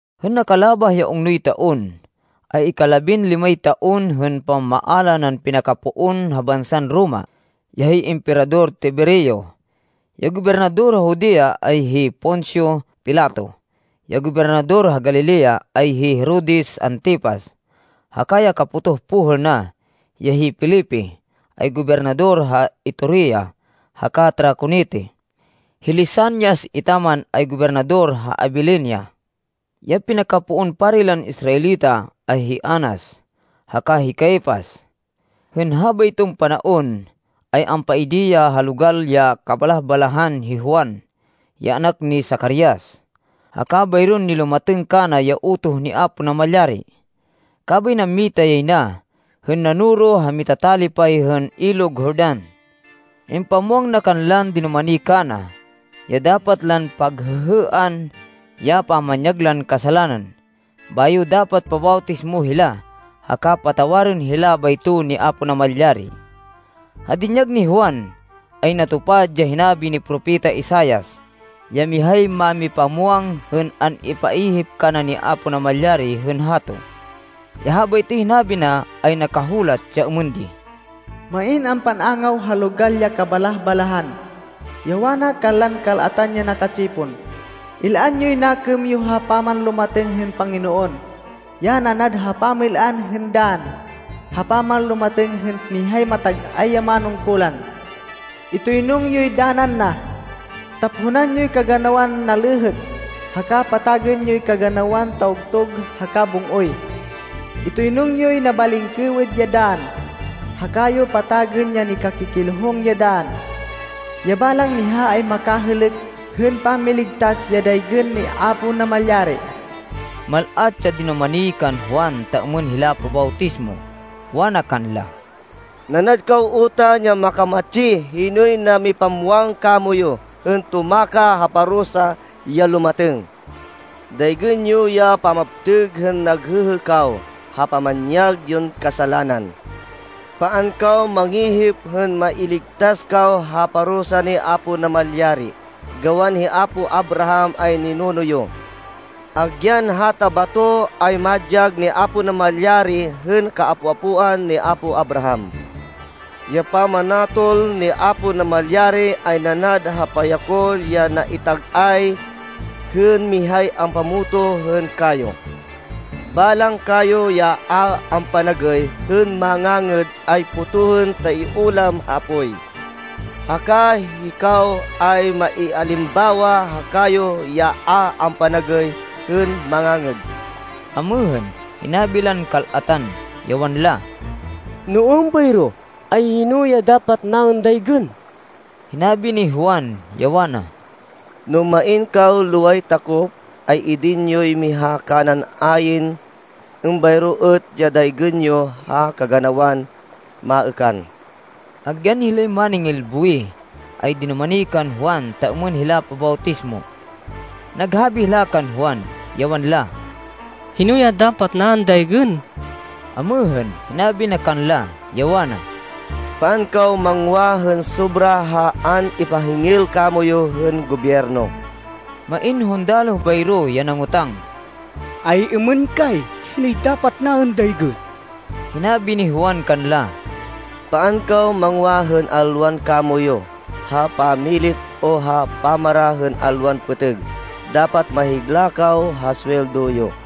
Hên nakalabah ya ungnoy taon, ay ikalabinlimay taon hên pamamaala nan pinakapoon ha bansan Roma, ya hi Emperador Tiberio. Ya gobernador ha Judea, ay hi Poncio Pilato. Ya gobernador ha Galilea, ay hi Herodes Antipas, haka ya kapotoh pohêl na, ya hi Felipe ay gobernador ha Iturea haka Traconite. Hi Lisanias etaman ay gobernador ha Abilinia. Ya pinakapoon pari lan Israelita, ay hi Anas haka hi Caifas. Hên habayton panaon, ay ampaidi ya ha logal ya kabalah-balahan hi Juan, ya anak ni Zacarias, haka bayron nilumatêng kana ya utoh ni Apo Namalyari, kabay nammita yay na hên nanoro ha mitatalipay hên Ilog Jordan. Impamwang na kanlan dinumani kana, ya dapat lan paghêhêan ya pamanyag lan kasalanan, bayo dapat pabawtismo hila, haka patawarên hila bayto ni Apo Namalyari. Ha dinyag ni Juan, ay natupad ya hinabi ni Propeta Isaias ya mihay mámipamwang hên an-ipaihip kana ni Apo Namalyari hên hato. Ya habaytoy hinabi na ay nakahulat, ya êmên di, “Main ampan-angaw ha logal ya kabalah-balahan, ya wana kanlan kal-atan ya naka-tsipon, ‘Il-an yoy nakêm yo ha pamanlumatêng hên Panginoon, Ya nanad ha pamil-an hên dann ha pamanlumatêng hên mihay matag-ay ya manungkulan. Itoynung yoy danan na. Taphonan yoy kaganawan nalêhêk, haka patagên yoy kaganawan tawgtug haka bung-oy. Itoynung yoy nabalingkêwêd ya dann, haka yo patagên ya nikakikilhung ya dann. Ya balang miha ay makahêlêk hên pamiligtas ya daygên ni Apo Namalyari.’” Mal-at ya dinumani kan Juan ta êmên hila pabawtismo. Wana kanla, “Nanad kaw utan ya makamatsi. Hinoy namipamwang kamoyu hên tumakah ha parusa ya lumatêng? Daygên yo ya pamaptêg hên naghêhê kaw ha pamanyag yon kasalanan. Paan kaw mangihip hên mailigtas kaw ha parusa ni Apo Namalyari, gawan hi apo Abraham ay ninuno yo. Agyan hata bato, ay madyag ni Apo Namalyari hên kaapo-apoan ni apo Abraham. Ya pamanatol ni Apo Namalyari ay nanad ha payakol ya naitag-ay hên mihay ampamotoh hên kayo. Balang kayo ya a ampanagêy hên mangangêd, ay potohên ta iulam ha apoy. Haka hikaw ay maialimbawa ha kayo ya a ampanagêy hên mangangêd.” Amêhên, hinabi lan kal-atan, ya wanla, “No êmbayro, ay hino ya dapat naên daygên?” Hinabi ni Juan, ya wana, “No main kaw loway takop, ay idin yoy miha kanan ayn. Êmbayro êt ya daygên yo ha kaganawan maêkan.” Agyan hilay máningil buwih ay dinumani kan Juan ta êmên hila pabawtismo. Naghabi hila kan Juan, ya wanla, “Hino ya dapat naên daygên?” Amêhên, hinabi na kanla, ya wana, “Paan kaw mangwa hên sobra ha an-ipahingil kamoyu hên gobyerno.” Main hundaloh bayro, ya nangotang, “Ay-êmên kay, hinoy dapat naên daygên?” Hinabi ni Juan kanla, “Paan kaw mangwa hên alwan kamoyu ha pamilit o ha pamara hên alwan pêtêg. Dapat mahigla kaw ha suweldo yo.”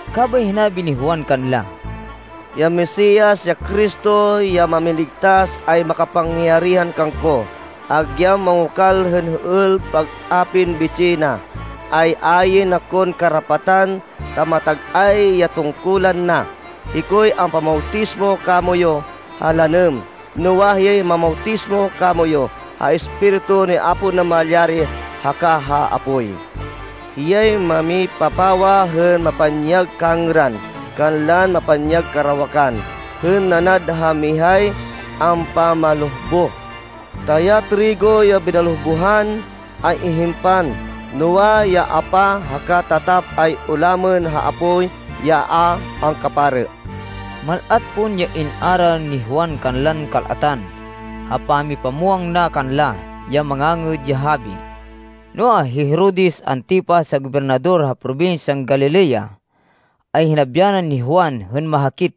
Kabay hinabi ni Juan kanla, “Ya Mesias, ya Cristo, ya Mámiligtas, ay makapangyarihan kangko. Agyan mangokal hên hêêl pag-apin bitsih na, ay ayn akon karapatan, ta matag-ay ya tungkulan na. Hikoy ampamawtismo kamoyu ha lanêm. Noa, hiyay mamawtismo kamoyu ha Espiritu ni Apo Namalyari haka ha apoy. Hiyay mamipapawa hên mapanyag kangêran kanlan mapanyag karawakan hên nanad ha mihay ampamalohboh. Ta ya trigo ya binalohbohan ay ihimpan, noa, ya apa haka tatap ay ulamên ha apoy ya a angkaparê.” Mal-at pon ya in-aral ni Juan kanlan kal-atan, ha pamipamwang na kanla ya Mangangêd ya Habi. Noa, hi Herodes Antipas, ya gobernador ha probinsyan Galilea, ay hinabyanan ni Juan hên mahakit,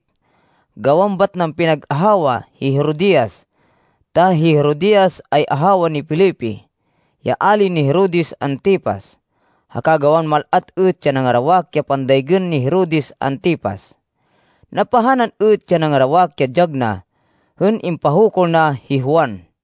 gawan bat nan pinag-ahawa hi Herodias, ta hi Herodias, ay ahawa ni Felipe, ya ali ni Herodes Antipas, haka gawan mal-at êt ya nangarawak ya pandaygên ni Herodes Antipas. Napahanan êt ya nangarawak ya dyag na hên impahukul na hi Juan.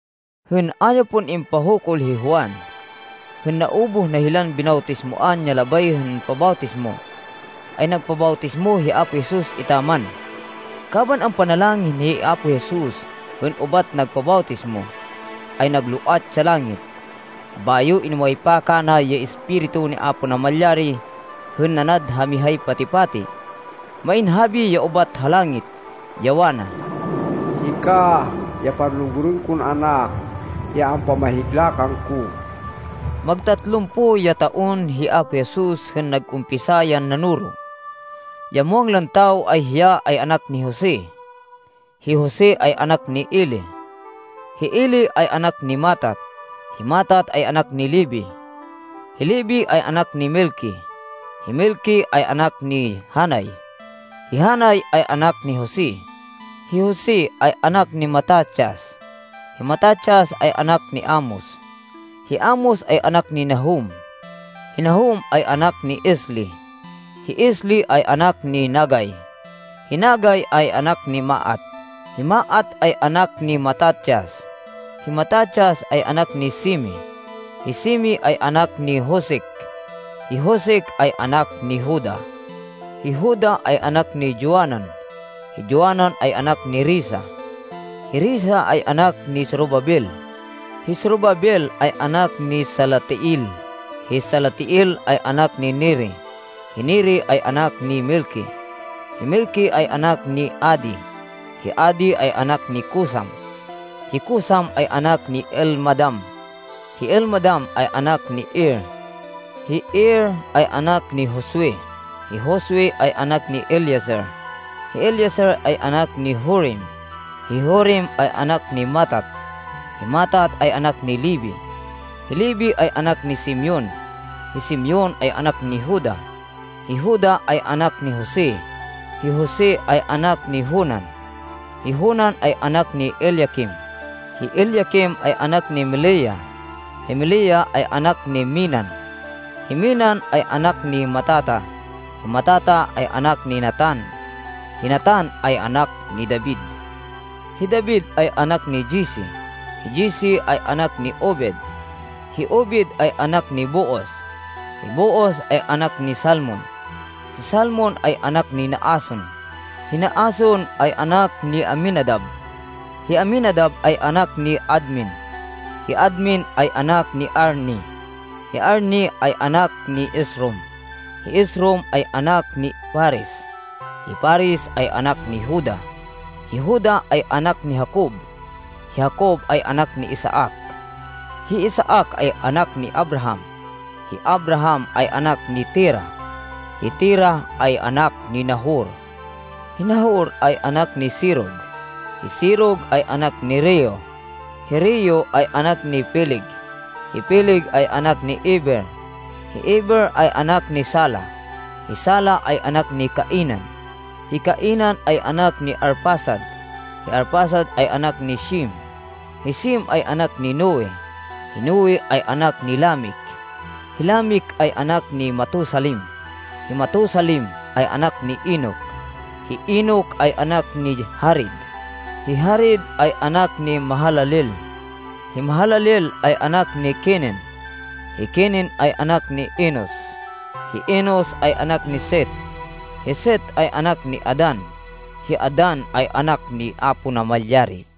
Hên a ya pon impahukul hi Juan, hên naubuh na hilan binawtismoan ya labay hên pabawtismo, ay nagpabawtismo hi Apo Jesus etaman. Kaban ampanalangin hi Apo Jesus, hên ubat nagpabawtismo, ay nagloat ya langit, bayo inumaypa kana ya Espiritu ni Apo Namalyari hên nanad ha mihay pati-pati. Main habi ya ubat ha langit, ya wana, “Hika ya panlugurên kon Anak ya ampamahigla kangko.” Mag tatlumpo ya taon hi Apo Jesus hên nag-umpisa yan nanoro. Ya muwang lan tawo ay hiya ay anak ni Jose. Hi Jose ay anak ni Eli. Hi Eli ay anak ni Matat, hi Matat ay anak ni Levi, hi Levi ay anak ni Melqui, hi Melqui ay anak ni Janai, hi Janai ay anak ni Jose, Hi Jose ay anak ni Matatias, hi Matatias ay anak ni Amos, hi Amos ay anak ni Nahum, hi Nahum ay anak ni Esli, hi Esli ay anak ni Nagai, Hi Nagai ay anak ni Maat, hi Maat ay anak ni Matatias, hi Matatias ay anak ni Semei, hi Semei ay anak ni Josec, hi Josec ay anak ni Joda, Hi Joda ay anak ni Joanan, hi Joanan ay anak ni Resa, hi Resa ay anak ni Zorobabel, hi Zorobabel ay anak ni Salatiel, hi Salatiel ay anak ni Neri, Hi Neri ay anak ni Melqui, hi Melqui ay anak ni Adi, hi Adi ay anak ni Cosam, hi Cosam ay anak ni Elmadam, hi Elmadam ay anak ni Er, Hi Er ay anak ni Josue, hi Josue ay anak ni Eliezer, hi Eliezer ay anak ni Jorim, hi Jorim ay anak ni Matat, hi Matat ay anak ni Levi, Hi Levi ay anak ni Simeon, hi Simeon ay anak ni Juda, hi Juda ay anak ni Jose, hi Jose ay anak ni Jonan, hi Jonan ay anak ni Eliaquim, Hi Eliaquim ay anak ni Melea, hi Melea ay anak ni Mennan, hi Mennan ay anak ni Matata, hi Matata ay anak ni Natan, hi Natan ay anak ni David, Hi David ay anak ni Jesse, hi Jesse ay anak ni Obed, hi Obed ay anak ni Booz, hi Booz ay anak ni Salmon, hi Salmon ay anak ni Naason, Hi Naason ay anak ni Aminadab, hi Aminadab ay anak ni Admin, hi Admin ay anak ni Arni, hi Arni ay anak ni Esrom, hi Esrom ay anak ni Farez, hi Farez ay anak ni Juda, Hi Juda ay anak ni Jacob, hi Jacob ay anak ni Isaac, hi Isaac ay anak ni Abraham, hi Abraham ay anak ni Terah, hi Terah ay anak ni Nahor, Hi Nahor ay anak ni Serug, hi Serug ay anak ni Reu, hi Reu ay anak ni Peleg, hi Peleg ay anak ni Eber, hi Eber ay anak ni Sala, Hi Sala ay anak ni Cainan, hi Cainan ay anak ni Arfaxad, hi Arfaxad ay anak ni Shem, hi Shem ay anak ni Noe, hi Noe ay anak ni Lamec, Hi Lamec ay anak ni Matusalem, hi Matusalem ay anak ni Enoc, hi Enoc ay anak ni Jared, hi Jared ay anak ni Mahalaleel, hi Mahalaleel ay anak ni Kenen, Hi Kenen ay anak ni Enos, hi Enos ay anak ni Set, hi Set ay anak ni Adan, hi Adan ay anak ni Apo Namalyari.